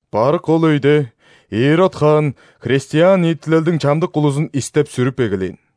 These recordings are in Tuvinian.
Барык ол өйде Ирод хаан христиан ниитилелдиң чамдык улузун истеп-сүрүп эгелээн.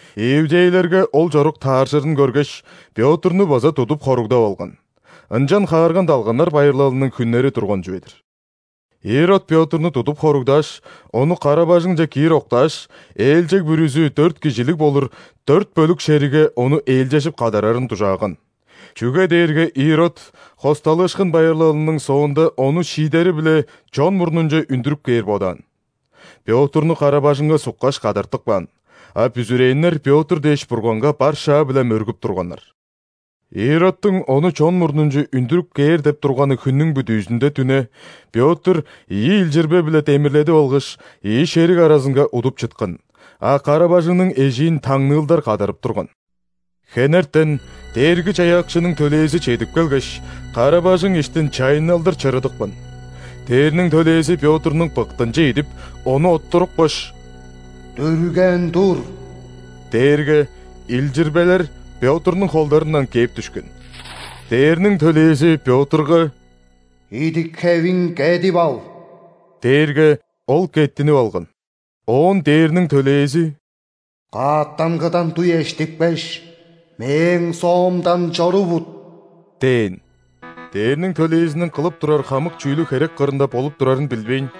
Иудейлерге ол чорук тааржырын көргеш, Пётрну база тудуп хоругдап алган (ынчан ·Хаарган далганнар байырлалының хүннери турган чүве-дир). Ирод Пётрну тудуп хоругдааш, ону кара-бажыңче киир октааш, ээлчег бүрүзү дөрт кижилиг болур дөрт бөлүк шеригге ону ээлчежип кадарарын дужааган. Чүге дээрге Ирод ·Хосталыышкын байырлалының соонда ону шиидери-биле чон мурнунче үндүрүп кээр бодаан. Пётрну кара-бажыңга суккаш, кадартып каан, а бүзүрээннер Петр дээш Бурганга бар шаа-биле мөргүп турганнар. Иродтуң ону чон мурнунче үндүрүп кээр деп турганы хүннүң бүдүүзүнде дүне Пётр ийи илчирбе-биле демирледип алгаш, ийи шериг аразынга удуп чыткан, а кара-бажыңның эжиин таңныылдар кадарып турган. Хенертен Дээрги-Чаяакчының төлээзи чедип келгеш, кара-бажың иштин чайынналдыр чырыдыпкан. Дээрниң төлээзи Пётрнуң быктынче идип, ону оттурупкаш: «Дүрген тур» – дээрге, илчирбелер Пётрнуң холдарындан кээп дүшкен. Дээрниң төлээзи Пётрга: «Идик-хевиң кедип ал» – дээрге, ол кеттинип алган. Оон ·дээрниң төлээзи: «Каъттангыдан дуй эштипкеш, мээң соомдан чорувут» – дээн. Дээрниң төлээзиниң кылып турар хамык чүүлү херек кырында болуп турарын билбейн,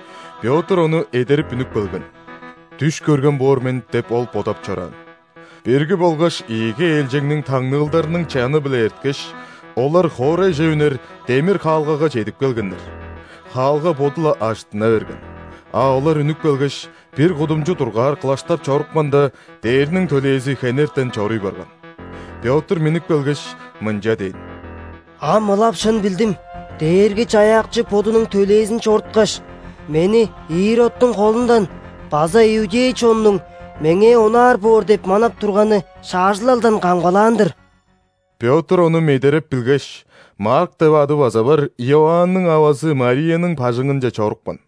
Пётр ону эдерип үнүп келген. «Дүш көрген боор мен» деп, ол бодап чораан. Бирги болгаш ийиги ээлчегниң таңныылдарының чаны-биле эрткеш, олар хоорайже үнер демир хаалгага чедип келгеннер. Хаалга боду-ла ажыттына берген, а олар үнүп келгеш, бир кудумчу дургаар кылаштап чорупканда, дээрниң төлээзи хенертен чоруй барган. Пётр миннип келгеш, мынча дээн: «Ам ылап шын билдим: Дээрги-Чаяакчы Бодунуң төлээзин чоруткаш, мени Иродтуң холундан база иудей чоннуң меңээ онаар боор деп манап турганы шаажылалдан камгалаан-дыр». Пётр ону медереп билгеш, Марк деп ады база бар Иоанның авазы Марияның бажыңынче чорупкан.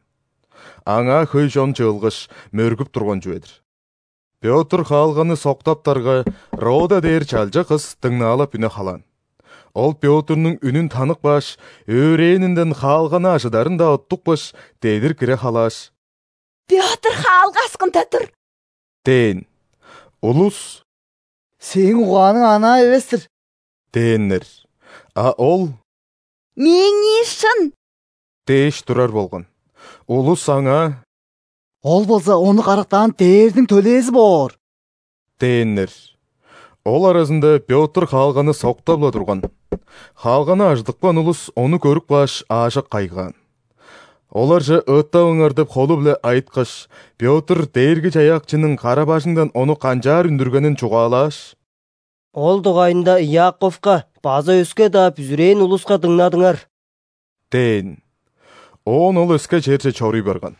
Аңаа хөй чон чыылгаш, мөргүп турган чүве-дир. Пётр хаалганы соктаптарга, Рода дээр чалча кыс дыңнаалап үне халаан. Ол Пётрнуң үнүн танып кааш, өөрээнинден хаалганы ажыдарын-даа уттупкаш, дедир хире халааш: «Пётр хаалга аксында тур!» – дээн. Улус: «Сээң угааның анаа эвес-тир» – дээннер. А ол: «Мээңии шын» – дээш турар болган. Улус аңаа: «Ол болза ону карактаан дээрниң төлээзи боор» – дээннер. Ол аразында Пётр хаалганы соктап-ла турган. Хаалганы ажыдыпкан улус ону көрүп кааш, аажок кайгаан. Оларже ыыттаваңар деп холу-биле айыткаш, Пётр Дээрги-Чаяакчының кара-бажыңдан ону канчаар үндүргенин чугаалааш: «Ол дугайында Иаковка база өске-даа бүзүрээн улуска дыңнадыңар» – дээн. Оон ол өске черже чоруй барган.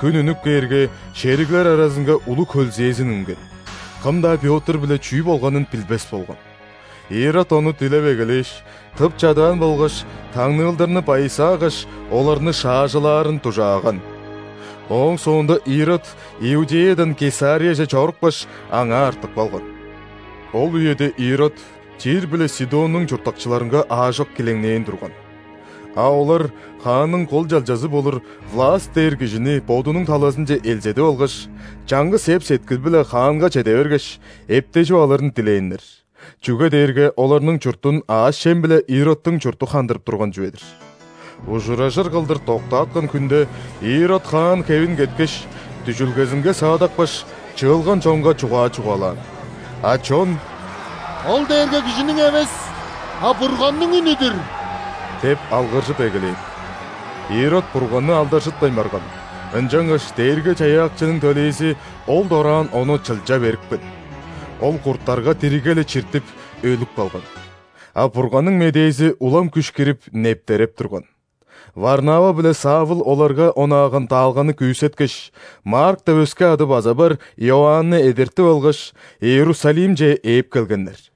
Хүн үнүп кээрге, шериглер аразынга улуг хөлзээзин үнген: кым-даа Пётр-биле чүү болганын билбес болган. Ирод ону дилеп эгелээш, тып чадаан болгаш таңныылдарны байысаагаш, оларны шаажылаарын дужааган. Ооң соонда Ирод Иудеядан Кесарияже чорупкаш, аңаа артып калган. Ол үеде Ирод Тир биле Сидоннуң чурттакчыларынга аажок килеңнээн турган. А олар хаанның кол чалчазы болур Власт дээр кижини бодунуң талазынче элзедип алгаш, чаңгыс эп-сеткил-биле хаанга чеде бергеш, эптежип алырын дилээннер, чүге дээрге оларның чуртун аъш-чем-биле Иродтуң чурту хандырып турган чүве-дир. Ужуражыр кылдыр доктааткан хүнде Ирод хаан хевин кеткеш, дүжүлгезинге саадапкаш, чыылган чонга чугаа чугаалаан. А чон: «Ол дээрге кижиниң эвес, а Бурганның үнү-дүр!» – деп алгыржып эгелээн. Ирод Бурганны алдаржытпайн барган, ынчангаш Дээрги-Чаяакчының төлээзи ол дораан ону чылча берипкен. Ол курттарга диригге-ле чиртип, өлүп калган. А Бурганның медээзи улам күш кирип, нептереп турган. Варнава биле Савл оларга онааган даалганы күүсеткеш, Марк деп өске ады база бар Иоанны эдертип алгаш, Иерусалимче ээп келгеннер.